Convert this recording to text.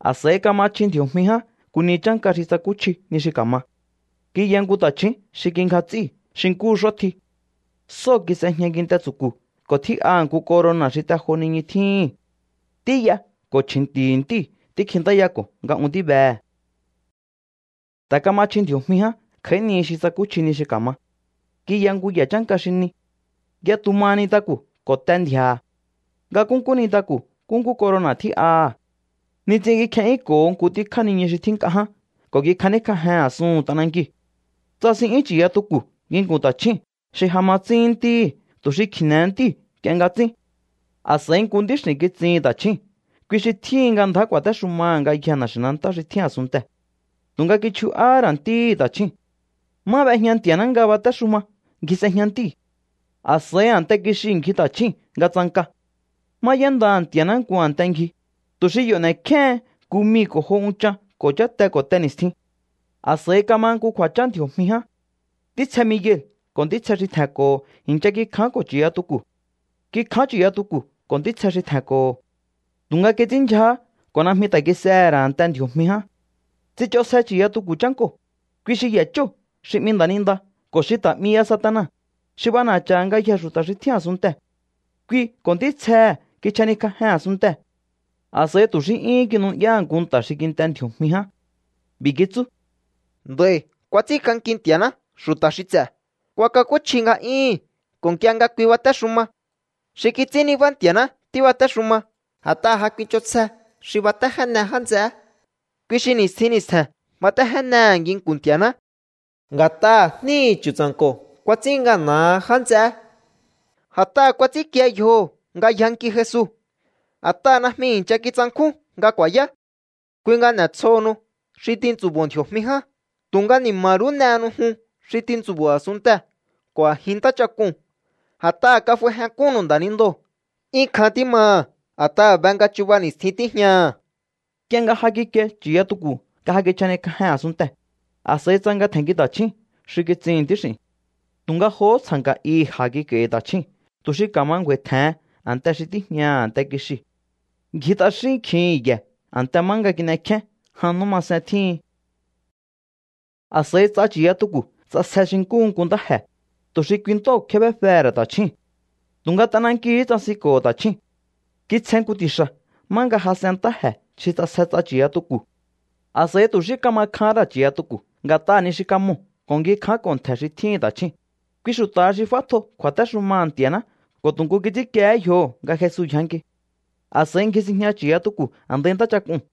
A̱s'a̱i kama chji ndji̱o̱jmi ján nku ni chánka xi tsakúchji ni xi ka̱ma. Kiya nku ta̱chju̱ún xi kingja ts'íu̱ xi nkúhu x'ótji. Sóo̱ kis'ejña kinte tsu̱ku̱ ko̱ tjín'aha̱ nku corona̱ xi te jo niñu tjíhi̱n. Ntí y'a ko̱ chji̱nti̱hi̱ ntíu̱ tíkjintáyako̱ nga un tíbehe̱. Ta̱ kama chji ndji̱o̱jmi ján kj'a̱í ni xi tsakúchji ni xi ka̱ma. Kiya nku ye̱ chánka xi ni. Yatu maha nintaku̱ ko̱ te ndji̱a̱ha̱. Nga nkúnkú nintaku̱ nkúnkú corona̱ tjí'aha̱. Nits'in kikje'yúnko̱ho nku tjíkjá niñu xi tjín nk'a ján ko̱ kikjaníkj'ajen a̱suhu̱n t'anankiu̱. Tsasin'yún chu̱yatuku̱ nginku̱n ta̱chju̱ún xi ja ma tsíhín ntíhi̱ tu̱ xi kji̱ne̱he ntíu̱ nk'ie nga tsín. A̱s'a̱i nku ntíx'i̱n kitsihi̱n ta̱chjúu̱n. Kui xi tjíhin nga ndjá ku̱a̱téxumaha̱ ngayjee̱ na̱xi̱nantá xi tjín a̱sunntee̱. Tu̱nga kichju'áhá ra̱ ntíhi̱ ta̱chjúu̱n. Má b'ejña Nti̱a̱ná nga batéxuma ngji s'ejña ntíu̱. A̱s'a̱i a̱nte kixiu̱ ngji ta̱chjúu̱n nga tsanka. Má y'éndaha̱ Nti̱a̱ná nku a̱nte ngji, tu̱ xi yo̱ n'e̱kjéhen nku mii̱ ko̱ jo unchan ko̱ cháte ko̱ te ni̱stjin. A̱s'a̱i kama nku kju̱a̱chán ndji̱o̱jmi ján. Ntítsje Miguel ko̱ ntítsje xi tje̱nko̱ho̱ i̱ncha kikjánko̱ chu̱yatuku̱. Kikján chu̱yatuku̱ ko̱ ntítsje xi tje̱nko̱ho̱. Tu̱nga kits'ínndyjahá ko̱ najmi ta̱ kis'ehe̱ ra̱ a̱nte ndji̱o̱jmi ján. Tsich'onsje chu̱yatuku̱ chánkoo̱, kui xi ye̱ chóo̱ xi 'mi nda̱ninda ko̱ xi ta̱ 'mi ya Satana, xi b'ana̱cha̱ha̱ ngayjee̱ xu̱ta̱ xi tjín a̱sunntee̱. Kui ko̱ ntítsjehe̱ kichjaníkj'ajen a̱sunntee̱. A̱s'a̱i tu̱ xí 'yúhún kinu'yáha̱ nku nta̱ xi kint'e ndji̱o̱jmi ján. B'i̱ kitsú: —Nd'a̱i̱ kuats'ínk'anki Nti̱a̱ná xu̱ta̱ xi ts'e̱, kuakakúchji nga'yúhu̱n ko̱ nk'ie nga kui batéxuma. Xi kits'ín nibá Nti̱a̱ná tíbatéxuma. A̱t'aha̱ ja kuich'onsje xi batéjéne já nts'eé. Kui xi ni̱stjin ni̱stje̱n batéjénehe̱ nginku̱n Nti̱a̱ná. Nga̱t'aha̱ jníhi̱ Chu̱tsa̱nko̱ kuats'ín ngana̱ha já nts'eé, a̱t'aha̱ kuats'ínkie yjoho̱ nga yjanki Jesu. A̱t'aha̱ najmi i̱ncha kitsankjún nga ku̱a̱yá. Kui nga n'e̱tsjohonu xi tintsu̱bo̱o ndji̱o̱jmi ján, tu̱nga ni̱ma̱ rú n'ehenu jun xi tintsu̱bo̱o a̱sunntee̱ ko̱ a̱jin ntáchak'uu̱n. A̱t'aha̱ kaf'aijénk'unnu̱u nda̱nindoo̱. 'Yún kjan tímaha̱ a̱t'aha̱ be nga chuba ni̱stjin tíjñaha̱. Nk'ie nga ja kikie chu̱yatuku̱ nga ja kichjanikj'ajen a̱sunntee̱, a̱s'a̱i tsanka tje̱nnki ta̱chju̱ún xi kitsihi̱n ntíx'i̱u̱n. Tu̱nga johó tsja̱nka̱ ihi̱ ja̱ kik'a̱i̱hi̱ ta̱chjúu̱n tu̱ xi ka̱ma ngju̱a̱i̱ tje̱hen a̱nte xi tíjñaha̱ a̱nte kixiu̱. Ngji t'axín kjihi̱n ye̱ a̱nte má nga kin'ekjén jan nú masen tjíhin. A̱s'a̱i ts'a chu̱yatuku̱ tsasje xi nkúhu nku ntáje̱, tu̱ xi kui ntóo̱ kjébéfehe̱ ra̱ ta̱chjúu̱n. Tu̱nga t'anankiu̱hú tsasinko̱ho̱ ta̱chjúu̱n. Kitsjen nku ti̱xa̱ má nga jas'en ntáje̱ xi ts'asje ts'a chu̱yatuku̱. A̱s'a̱i tu̱ xí kama kjahán ra̱ chu̱yatuku̱ nga̱t'aha̱ ni xi kamoo̱ ko̱ ngji kjánko̱ ntje̱ xi tjíhi̱n ta̱chjúu̱n, kui xu̱ta̱ha xi f'átjo kju̱a̱téxumaha̱ Nti̱a̱ná ko̱ tu̱ nku kits'ínkiehé yjoho̱ nga Jesu yjanki. A̱s'a̱i ngji sinjña chu̱yatuku̱ a̱ndai ntáchak'uu̱n.